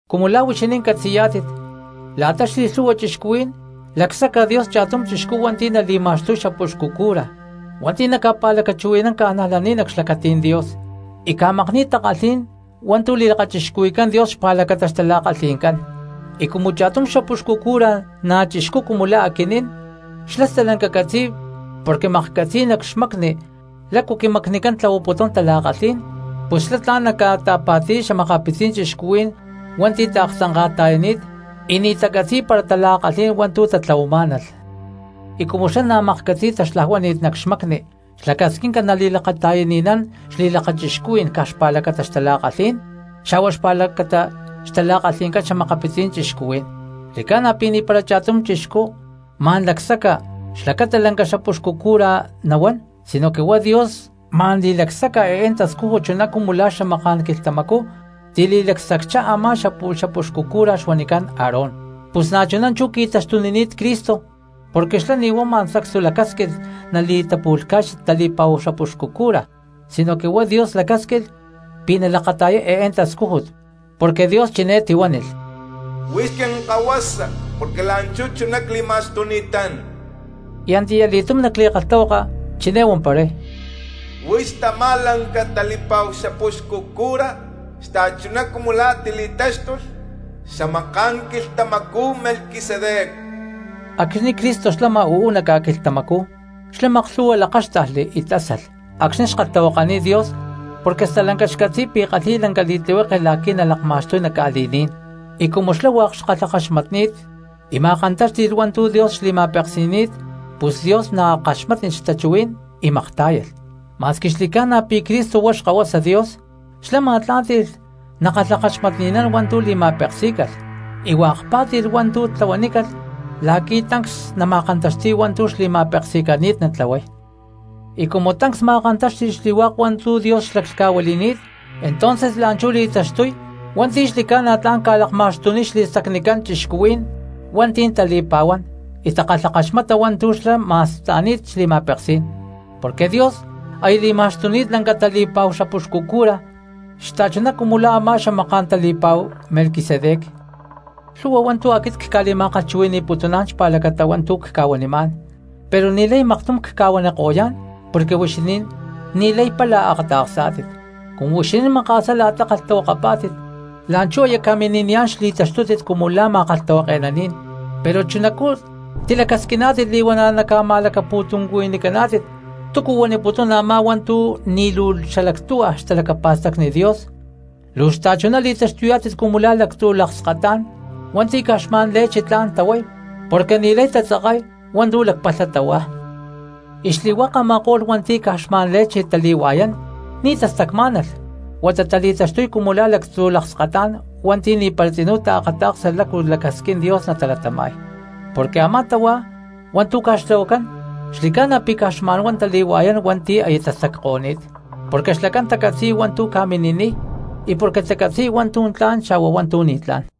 Cumu la̠ huixinín catzi̠yá̠tit, la̠ta xli̠lhu̠hua cristianos lacsaca Dios cha̠tum chixcú hua̠nti̠ nali̠ma̠xtuy xapuxcu cura hua̠nti̠ naca̠pa̠lacachuhui̠nán cristianos nac xlacatí̠n Dios y ca̠makni̠y takalhí̠n hua̠ntu̠ li̠lakachixcuhui̠cán Dios xpa̠lacata xtala̠kalhi̠ncán cristianos. Y cumu cha̠tum xapuxcu cura na̠ chixcú cumu la̠ aquinín xlá stalanca catzi̠y porque maklhcatzi̠y nac xmacni lácu quimacnicán tlahuaputún tala̠kalhí̠n; pus xlá tla̠n naca̠ta̠pa̠ti̠y xa̠makapitzí̠n xta̠cristianos hua̠nti̠ taaktzanka̠ta̠yani̠t y ni̠ tacatzi̠y para tala̠kalhí̠n hua̠ntu̠ tatlahuamá̠nalh. Y cumu xlá na̠ maklhcatzi̠y taxlajuani̠ni̠t nac xmacni xlacasquinca nali̠lakata̠yani̠nán xli̠lakachixcuhuí̠n caj xpa̠lacata xtala̠kalhí̠n, xa̠hua xpa̠lacata xtala̠kalhi̠ncán xa̠makapitzí̠n cristianos. Xli̠cána pi̠ ni̠para cha̠tum chixcú ma̠n lacsaca xlacata lanca xapuxcu cura nahuán, sinoque huá Dios ma̠n li̠lacsaca eé tascújut chuná cumu la̠ xamaká̠n quilhtamacú tili̠lacsacchá a̠má xapu̠lh xapuxcu cura xuanicán Aarón. Pus na̠chuná chú qui̠taxtunini̠t Cristo porque xlá ni̠ huá ma̠n sacstu lacásquilh nali̠tapu̠lhca̠y tali̠pa̠hu xapuxcu cura, sinoque huá Dios lacásquilh pi̠ nalakata̠yay eé tascújut, porque Dios chiné tihuánilh: Huix quinkahuasa porque la̠nchú chuná cli̠ma̠xtuni̠tán. Y antiyali̠túm nac li̠kalhtahuaka chiné huamparay: Huix tamá lanca tali̠pa̠hu xapuxcu cura, xta̠chuná cumu la̠ tili̠táxtulh xamaká̠n quilhtamacú Melquisedec. Acxni̠ Cristo xlama uú nac ca̠quilhtamacú xlá maklhu̠hua lakáxtajli y tásalh acxni̠ xkalhtahuakaniy Dios porque stalanca xcatzi̠y pi̠ kalhi̠y lanca li̠tlihueke la̠qui̠ nalakma̠xtuy nac ca̠li̠ní̠n; y cumu xlá hua̠k xkalhakaxmatni̠t y ma̠kantáxti̠lh hua̠ntu̠ Dios xli̠ma̠peksi̠ni̠t pus Dios na̠ kaxmátnilh xtachuhuí̠n y maktá̠yalh. Ma̠squi xli̠ca̠na pi̠ Cristo huá Xkahuasa Dios xlá ma̠tlá̠nti̠lh nakalhakaxmatni̠nán hua̠ntu̠ li̠ma̠peksí̠calh, y hua̠k pá̠ti̠lh hua̠ntu̠ tlahuanícalh la̠qui̠ tancs nama̠kantaxti̠y hua̠ntu̠ xli̠ma̠peksi̠nani̠t natlahuay. Y cumu tancs ma̠kantáxti̠lh xli̠hua̠k hua̠ntu̠ Dios xlaclhca̠huili̠ni̠t entonces la̠nchú li̠taxtuy hua̠nti̠ xli̠ca̠na tla̠n ca̠lakma̠xtuniy xli̠stacnicán cristianos hua̠nti̠ tali̠pa̠huán y takalhakaxmata hua̠ntu̠ xlá ma̠sta̠ni̠t xli̠ma̠peksí̠n, porque Dios aya li̠ma̠xtuni̠t lanca tali̠pa̠hu xapuxcu cura xta̠chuná cumu la̠ a̠má xamaká̠n tali̠pa̠hu Melquisedec. Lhu̠hua hua̠ntu̠ aquit cca̠li̠ma̠kalhchuhui̠ni̠putuná̠n xpa̠lacata hua̠ntu̠ cca̠huanimá̠n pero ni̠lay maktum cca̠huaniko̠yá̠n porque huixinín ni̠lay pála akata̠ksá̠tit. Cumu huixinín maka̠sá la̠ta kalhtahuakapá̠tit la̠nchú aya ca̠mini̠niyá̠n xli̠taxtútit cumu la̠ ma̠kalhtahuake̠naní̠n, pero chunacú tilacasquiná̠tit li̠huana̠ caca̠ma̠lacapu̠tuncuhui̠nicántit túcu huaniputún a̠má hua̠ntu̠ ni̠ luu xalactuhua xtalacapa̠stacni Dios. Luu xta̠chuná li̠taxtuyá̠tit cumu la̠ lactzu̠ lakskatá̠n hua̠nti̠ caj xma̠n leche tla̠n tahuay porque ni̠lay tatzakay hua̠ntu̠ lacpalha tahuá. Y xli̠hua̠k a̠ma̠ko̠lh hua̠nti̠ caj xma̠n leche tali̠hua̠yán ni̠ tastacmá̠nalh huata tali̠taxtuy cumu la̠ lactzu̠ lakskatá̠n hua̠nti̠ ni̠para tzinú taakata̠ksa lácu lacasquín Dios natalatama̠y. Porque a̠má tahuá hua̠ntu̠ ca̠xtlahuacán xli̠ca̠na pi̠ caj xma̠n huá tali̠hua̠yán hua̠nti̠ aya tastacko̠ní̠t, porque xlacán tacatzi̠y hua̠ntu̠ ca̠mini̠niy y porque tacatzi̠y hua̠ntu̠ tla̠n xa̠hua hua̠ntu̠ ni̠tlá̠n.